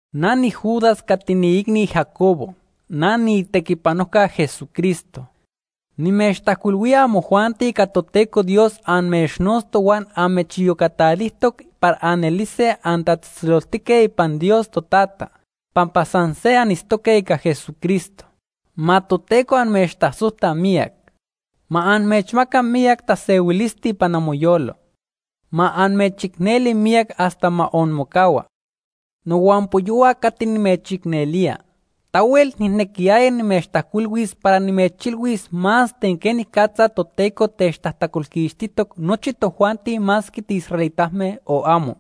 Na niJudas cati niiicni Jacobo. Na niitequipanojca Jesucristo. Nimechtajcuilhuía amojuanti cati Toteco Dios amechnotztoc huan amechiyocacajtoc para anelise antatzejtzeloltique ipan Dios Totata pampa san se anitztoque ica Jesucristo. Ma Toteco amechtasojta miyac. Ma amechmaca miyac tasehuilisti ipan amoyolo. Ma amechicneli miyac hasta ma onmocahua. Nohuampoyohua cati nimechicnelía, tahuel nijnequiyaya nimechtajcuilhuis para nimechilhuis más ten quenicatza Toteco techtajtacolquixtijtoc nochi tojuanti masque tiisraelitame o amo.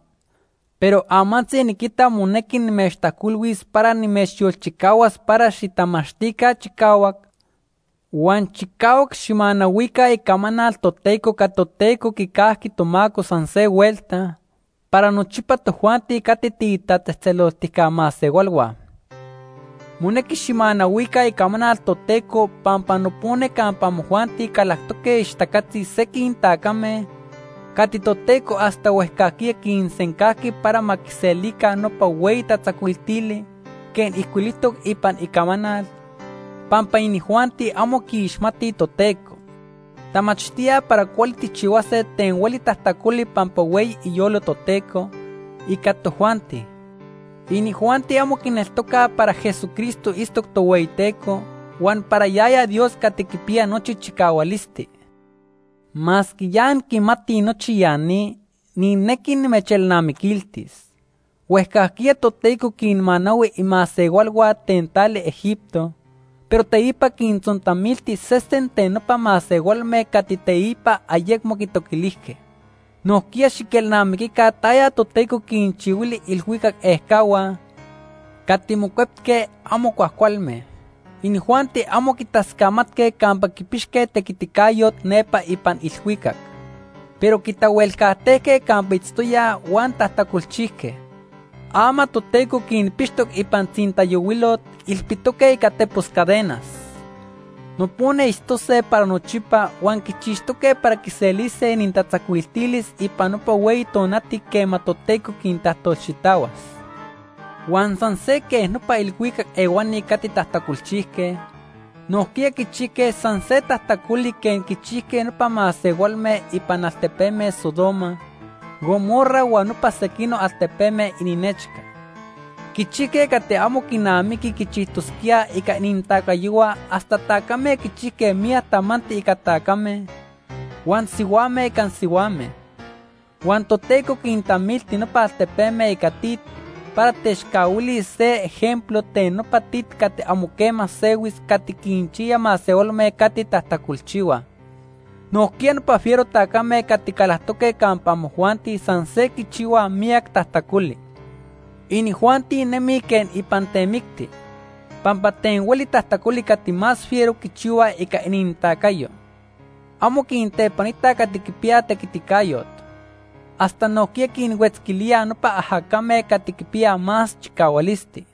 Pero amantzi niquita monequi nimechtajcuilhuis para nimechyolchicahuas para xitamachtica chicahuac huan chicahuac xijmanahuica icamanal Toteco cati Toteco quicajqui tomaco san se huelta para nochipa tojuanti cati tiitatzejtzeloltijca masehualhua. Monequi xijmanahuica icamanal Toteco pampa nopona campa amojuanti calactoque ixtacatzi sequij tacame cati Toteco hasta huejcajquiya quisencajqui para ma quiselica nopa hueyi tatzacuiltili quej ijcuilijtoc ipan Icamanal, pampa inijuanti amo quiixmatij Toteco. Tamachtíaj para cuali tijchihuase ten hueli tajtacoli pampa hueyi iyolo Toteco ica tojuanti. Inijuanti amo quineltocaj para Jesucristo itztoc Tohueyiteco huan para yaya Dios Cati Quipiya Nochi Chicahualisti. Masque ya anquimatij nochi ya ni, nijnequi nimechelnamiquiltis. Huejcajquiya Toteco quinmanahui imasehualhua ten tali Egipto, pero teipa quintzontamilti sesen ten nopa masehualme cati teipa ayecmo quitoquilijque. Nojquiya xiquelnamiquica taya Toteco quinchihuili iilhuicac ejcahua cati mocuetque amo cuajcualme. Inijuanti amo quitascamatque campa quipixque tequiticayot nepa ipan ilhuicac, pero quitahuelcajtejque campa itztoyaj huan tajtacolchijque. Ama Toteco quinpixtoc ipan tzintayohuilot ilpitoque ica tepos cadenas. Nopona itztose para nochipa huan quichixtoque para quiselise inintatzacuiltilis ipan nopa hueyi tonati quema Toteco quintajtolxitahuas. Huan san se quej nopa ilhuicac ehuani cati tajtacolchijque, nojquiya quichijque san se tajtacoli quej quichijque nopa masehualme ipan altepeme Sodoma, Gomorra huan nopa sequinoc altepeme ininechca. Quichijque cati amo quinamiqui quichijtosquíaj ica inintacayohua hasta tacame quichijque miyac tamanti ica tacame, huan sihuame ica sihuame. Huan Toteco quintamilti nopa altepeme ica tit para techcahuilis se ejemplo ten nopa tit cati amo quema sehuis cati quinchiya masehualme cati tajtacolchihuaj. Nojquiya nopa fiero tacame cati calactoque campa amojuanti san se quichihuaj miyac tajtacoli. Inijuanti nemij quej ipan temicti, pampa ten hueli tajtacoli cati más fiero quichihuaj ica inintacayo. Amo quintepanitaj cati quipiyaj tequiticayot. Hasta nojquiya quinhuetzquilíaj nopa ajacame cati quipiyaj más chicahualisti.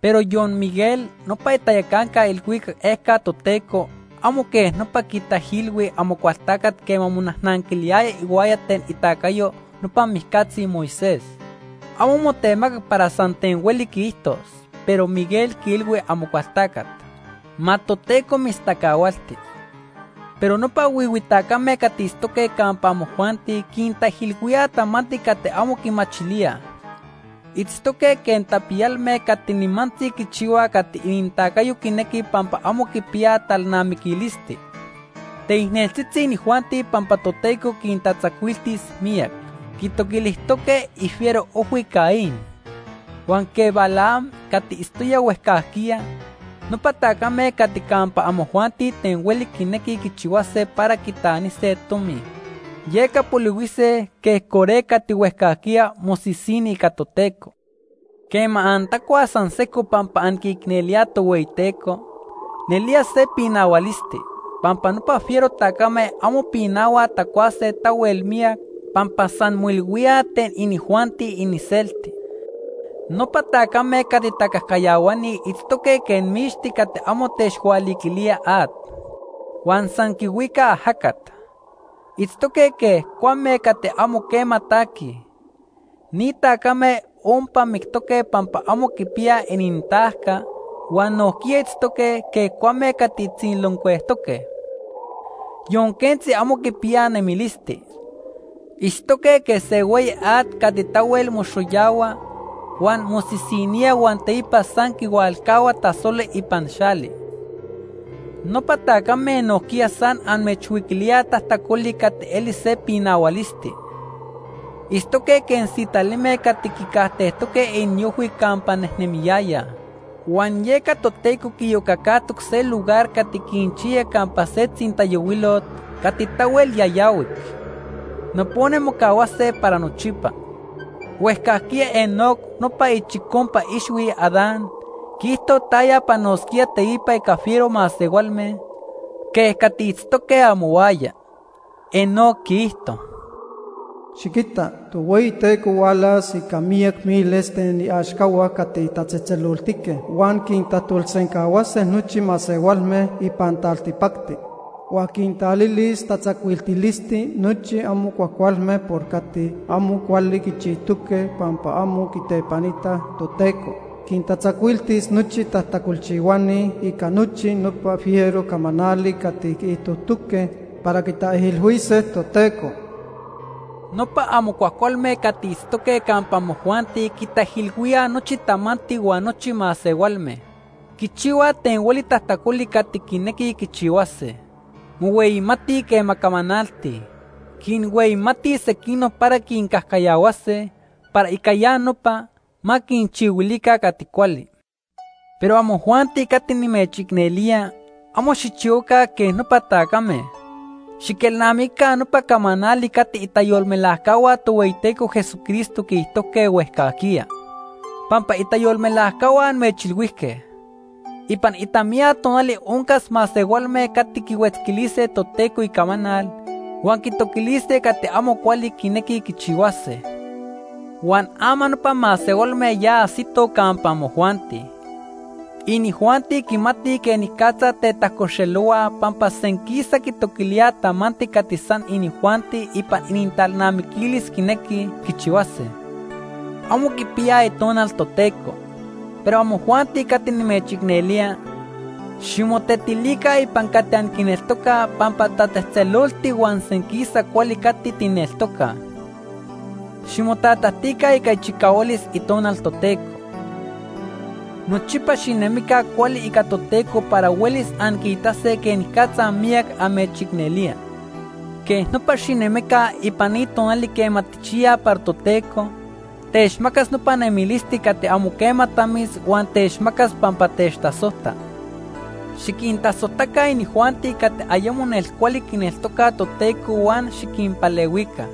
Pero yon Miguel, nopa itayacanca ilhuicac ejca Toteco, amo quej nopa quitaijilhui Amocualtacat quema monajnanquiliyaya ihuaya ten itacayo nopa mijcatzi Moisés. Amo motemacac para san ten hueli quiijtos, pero Miguel quiilhui Amocualtacat: “Ma Toteco mitztacahualti.” Pero nopa huihui tacame cati itztoque campa amojuanti quintaijilhuíaj tamanti cati amo quimachilíaj. Itztoque quej tapiyalme cati nimantzi quichihuaj cati inintacayo quinequi pampa amo quipiyaj talnamiquilisti. Teicneltzitzi inijuanti pampa Toteco quintatzacuiltis miyac. Quitoquilijtoque ifiero ojhui Caín. Huan quej Balaam cati itztoya huejcajquiya, nopa tacame cati campa amojuanti ten hueli quinequij quichihuase para quitanise tomi. Yeca polihuise quej Coré cati huejcajquiya mosisini ica Toteco. Quema antacuaj san sejco pampa anquiicnelíaj Tohueyiteco, nelía se pinahualisti, pampa nopa fiero tacame amo pinahuaj tacuase tahuel miyac pampa san moilhuíaj ten inijuanti iniselti. Nopa tacame cati tacajcayahuani itztoque quej mixti cati amo techhualiquilía at huan san quihuica ajacat. Itztoque quej cuame cati amo quema taquij. Ni tacame ompa mictoque pampa amo quipiyaj inintajca, huan nojquiya itztoque quej cuame cati tziloncuejtoque. Yon quentzi amo quipiyaj nemilisti. Itztoque quej se hueyi at cati tahuel moxoyahua huan mosisinía huan teipa san quihualcahua tasoli ipan xali. Nopa tacame nojquiya san amechhuiquilíaj tajtacoli cati eli se pinahualisti. Itztoque quej sitalime cati quicajtejtoque iniojhui campa nejnemiyayaj, huan yeca Toteco quiiyocacajtoc se lugar cati quinchiya campa se tzintayohuilot cati tahuel yayahuic. Nopona mocahuase para nochipa. Huejcajquiya Enoc nopa ichicompa ixhui Adán quiijto taya panosquía teipa ica fiero masehualme quej cati itztoque amohuaya. Enoc quiijto: “Xiquita, Tohueyiteco hualas ica miyac miles ten iaxcahua cati tatzejtzeloltique, huan quintajtolsencahuase nochi masehualme ipan taltipacti. Huan quintalilis tatzacuiltilisti nochi amo cuajcualme por cati amo cuali quichijtoque pampa amo quitepanitaj Toteco. Quintatzacuiltis nochi tajtacolchihuani ica nochi nopa fiero camanali cati quiijtojtoque para quitaijilhuise Toteco.” Nopa amo cuajcualme cati itztoque campa amojuanti quitaijilhuíaj nochi tamanti huan nochi masehualme. Quichihuaj ten hueli tajtacoli cati quinequij quichihuase. Mohueyimatij quema camanaltij. Quinhueyimatij sequinoc para quincajcayahuase, para ica ya nopa, ma quinchihuilica cati cuali. Pero amojuanti cati nimechicnelía, amo xijchihuaca quej nopa tacame. Xiquelnamiquica nopa camanali cati itayolmelajcahua Tohueyiteco Jesucristo quiijtojque huejcajquiya. Pampa itayolmelajcahua amechilhuijque: “Ipan itamiya tonali oncas masehualme cati quihuetzquilise Toteco Icamanal huan quitoquilise cati amo cuali quinequij quichihuase.” Huan ama nopa masehualme ya ajsitoj campa amojuanti. Inijuanti quimatij quenicatza tetajcoxelohuaj pampa senquisa quitoquilíaj tamanti cati san inijuanti ipan inintalnamiquilis quinequij quichihuase. Amo quipiyaj Itonal Toteco. Pero amojuanti cati nimechicnelía, ximotetilica ipan cati anquineltocaj pampa tatzejtzeloltic huan senquisa cuali cati tijneltocaj. Ximotatajtica ica ichicahualis Itonal Toteco. Nochipa xinemica cuali ica Toteco para huelis anquiitase quenicatza miyac amechicnelía. Quej nopa xinemica ipan ni tonali quema tijchiyaj para Toteco techmacas nopa nemilisti cati amo quema tamis huan techmacas pampa techtasojta. Xiquintasojtaca inijuanti cati ayemo nelcuali quineltocaj Toteco huan xiquinpalehuica.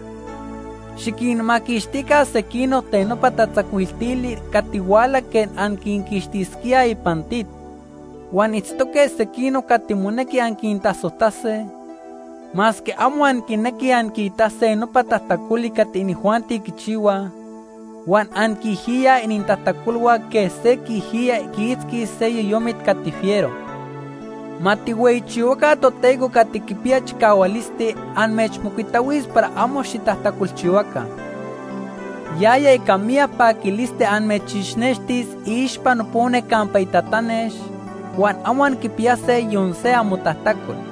Xiquinmaquixtica sequinoc ten nopa tatzacuiltili cati huala quej anquinquixtisquíaj ipan tit. Huan itztoque sequinoc cati monequi anquintasojtase, masque amo anquinequij anquiitase nopa tajtacoli cati inijuanti quichihuaj huan anquiijiyaj inintajtacolhua quej se quiijiyaj quiitzquis se yoyomit cati fiero. Ma tijhueyichihuaca Toteco cati quipiya chicahualisti amechmocuitahuis para amo xitajtacolchihuaca. Yaya ica miyac paquilisti amechixnextis iixpa nopona campa itatanex huan amo anquipiyase yon se amotajtacol.